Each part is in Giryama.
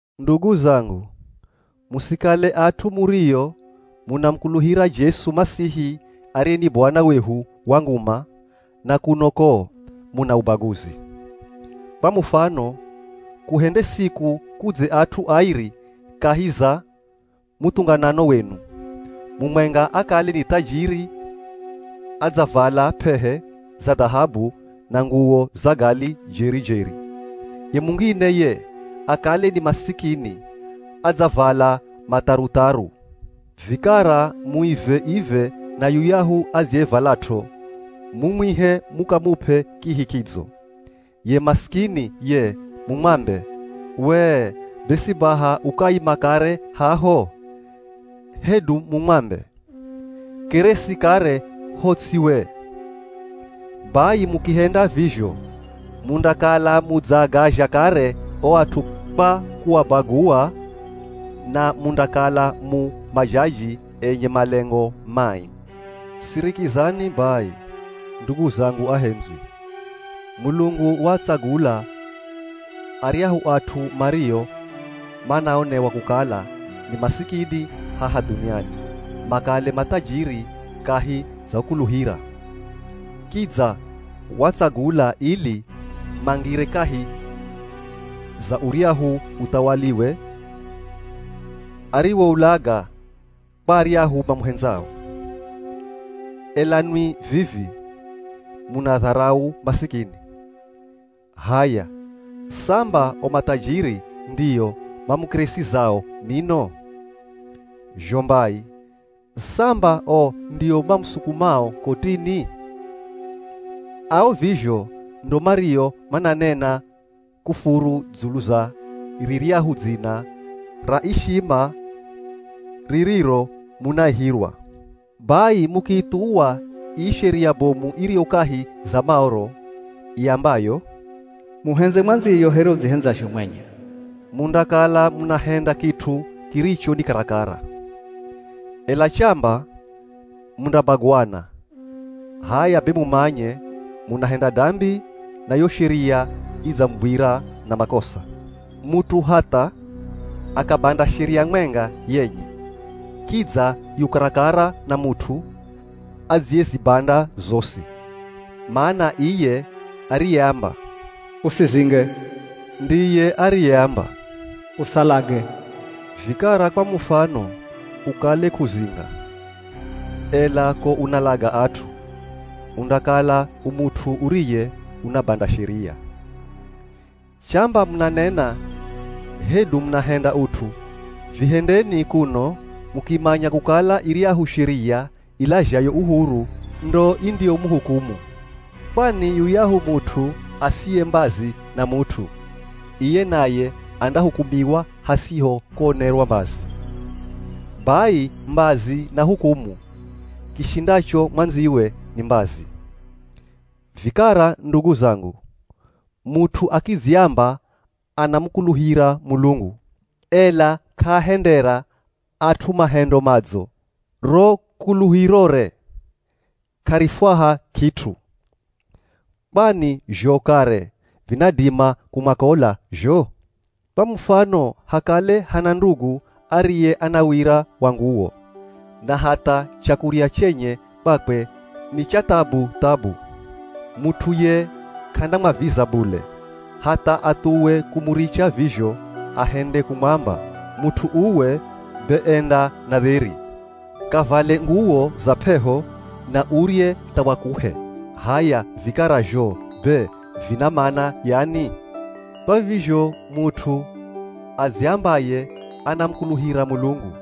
Ndugu zangu, musikale at'u murio munamukuluhira Jesu Masihi ariye ni Bwana wehu wa nguma, na kuno ko muna ubaguzi. Kwa mufano kuhende siku kudze at'u airi kahi za muthunganano wenu. Mumwenga akale ni thajiri, adzavala p'ehe za dhahabu na nguwo za gali jeri-jeri, ye mungine ye akale ni masikini, adzavala matharutharu. Vikara muive-ive na yuyahu adziyevalat'o, mumwihe mukamup'e kihi kidzo. Ye masikini ye mumwambe, “We, be si baha ukaima kare haho,” hedu mumwambe, “keresi kare ho ts'i we.” Bai mukihenda vizho mundakala mudzaagazha kare o at'u kwa kuabagua na mundakala mu majaji enye malengo mai. Sirikizani bai, ndugu zangu ahendzwi! Mulungu waatsagula aryahu at'u mario manaonewa kukala ni masikini haha dhuniani, makale mathajiri kahi za kukuluhira. Kidza waatsagula ili mangire kahi za uryahu uthawaliwe ariwoulaga kwa aryahu mamuhendzao. Ela nwi vivi, munaadharau masikini. H'aya, samba o mathajiri ndio mamukeresizao mino! Zho mbai, samba o ndio mamusukumao kotini? Ao vizho ndo mario mananena kufuru dzulu za riryahu dzina ra ishima ririro munaihirwa. Bai mukiithuwa ii sheria bomu iriyo kahi za Maoro, iambayo, “Muhendze mwandziyo here udzihendzazho mwenye,” mundakala munahenda kit'u kiricho ni karakara. Ela chamba mundabaguana, h'aya be mumanye munahenda dambi na yo sheria idzamugwira na makosa. Mut'u hatha akabanda sheria mwenga yenye, kidza yu karakara na mut'u adziyezibanda zosi. Mana iye ariyeamba, “Usizinge,” ndiye ariyeamba, “Usalage.” Vikara kwa mufano ukale k'uzinga, ela ko unalaga at'u, undakala u mut'u uriye unabanda sheria. Chamba munanena hedu munahenda ut'u, vihendeni kuno mukimanya kukala iryahu sheria ilazhayo uhuru ndo indiyomuhukumu. Kwani yuyahu mut'u asiye mbazi na mut'u, iye naye andahukumiwa hasiho kuonerwa mbazi. Bai mbazi na hukumu, kishindacho mwandziwe ni mbazi. Vikara ndugu zangu, mut'u akidziamba anamukuluhira Mulungu, ela k'aahendera at'u mahendo madzo, ro kuluhirore k'arifwaha kit'u. Kwani zho kare vinadima kumwakola zho? Kwa mufano hakale hana ndugu ariye ana wira wa nguwo na hatha chakurya chenye kwakwe ni cha thabu-thabu. Mut'u ye k'andamwaviza bule, hatha athuwe kumuricha vizho ahende kumwamba, “Mut'u uwe be enda na dheri, kavale nguwo za p'eho na urye tha wakuhe.” H'aya vikara zho be vina mana yani? Kwa vizho mut'u adziambaye anamukuluhira Mulungu,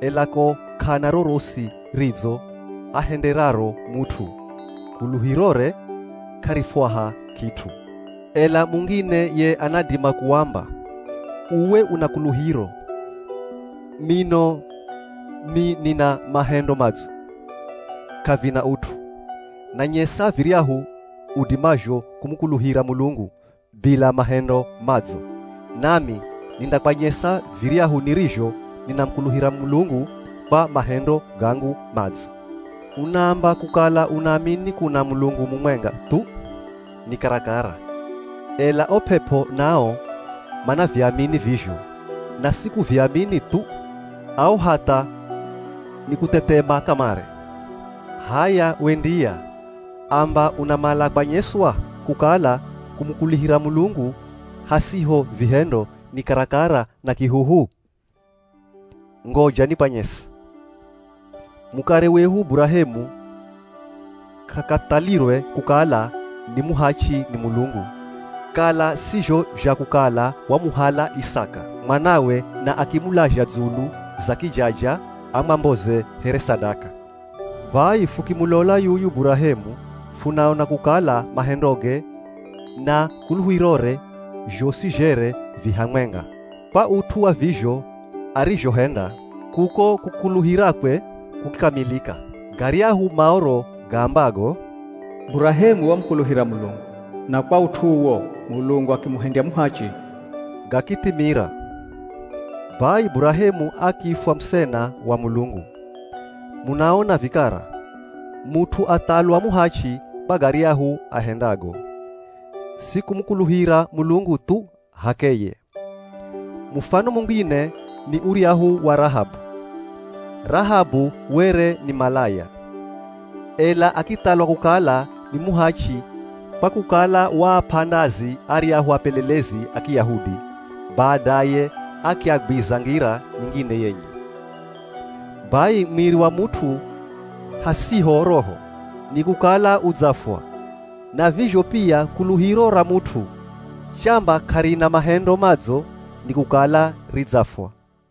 ela ko k'ana rorosi ridzo ahenderaro mut'u, kuluhirore k'arifwaha kit'u. Ela mungine ye anadima kuamba, “Uwe, una kuluhiro, mino mi nina mahendo madzo.” K'avina ut'u. Nanyesa viryahu udimazho kumukuluhira Mulungu bila mahendo madzo, nami nindakwanyesa viryahu nirizho ninamukuluhira Mulungu kwa mahendo gangu madzo. Unaamba kukala unaamini kuna Mulungu mumwenga thu, ni karakara, ela o p'ep'o nao manaviamini vizho, na si kuviamini thu, ao hatha nikuthethema kamare. H'aya, we ndiya, amba unamala kwanyeswa, kukala kumukuluhira Mulungu hasiho vihendo ni karakara na kihuhu. Ngoja nikwanyese. Mukare wehu Burahemu k'akathalirwe kukala ni muhachi ni Mulungu kala si zho zha kukala wamuhala Isaka, mwanawe na akimulaza dzulu za kijaja amwamboze here sadaka. Bai fukimulola yuyu Burahemu funaona kukala mahendoge na kuluhirore zhosi zhere vi hamwenga. Kwa ut'u wa vizho arizhohenda, kuko kukuluhirakwe kukikamilika. Garyahu Maoro gaambago, “Burahemu wamukuluhira Mulungu, na kwa ut'u uwo Mulungu akimuhendya muhachi,” gakithimira. Bai Burahemu akiifwa musena wa Mulungu. Munaona vikara, mut'u athalwa muhachi kwa garyahu ahendago, si kumukuluhira Mulungu thu h'akeye. Mufano mungine ni uryahu wa Rahabu. Rahabu were ni malaya, ela akithalwa kukala ni muhachi kwa kukala waap'a ndazi aryahu apelelezi a Kiyahudi, badaye akiagwiza ngira nyingine yenye. Bai mwiri wa mut'u hasiho roho, ni kukala udzafwa, na vizho pia kuluhiro ra mut'u chamba k'arina mahendo madzo nikukala ridzafwa.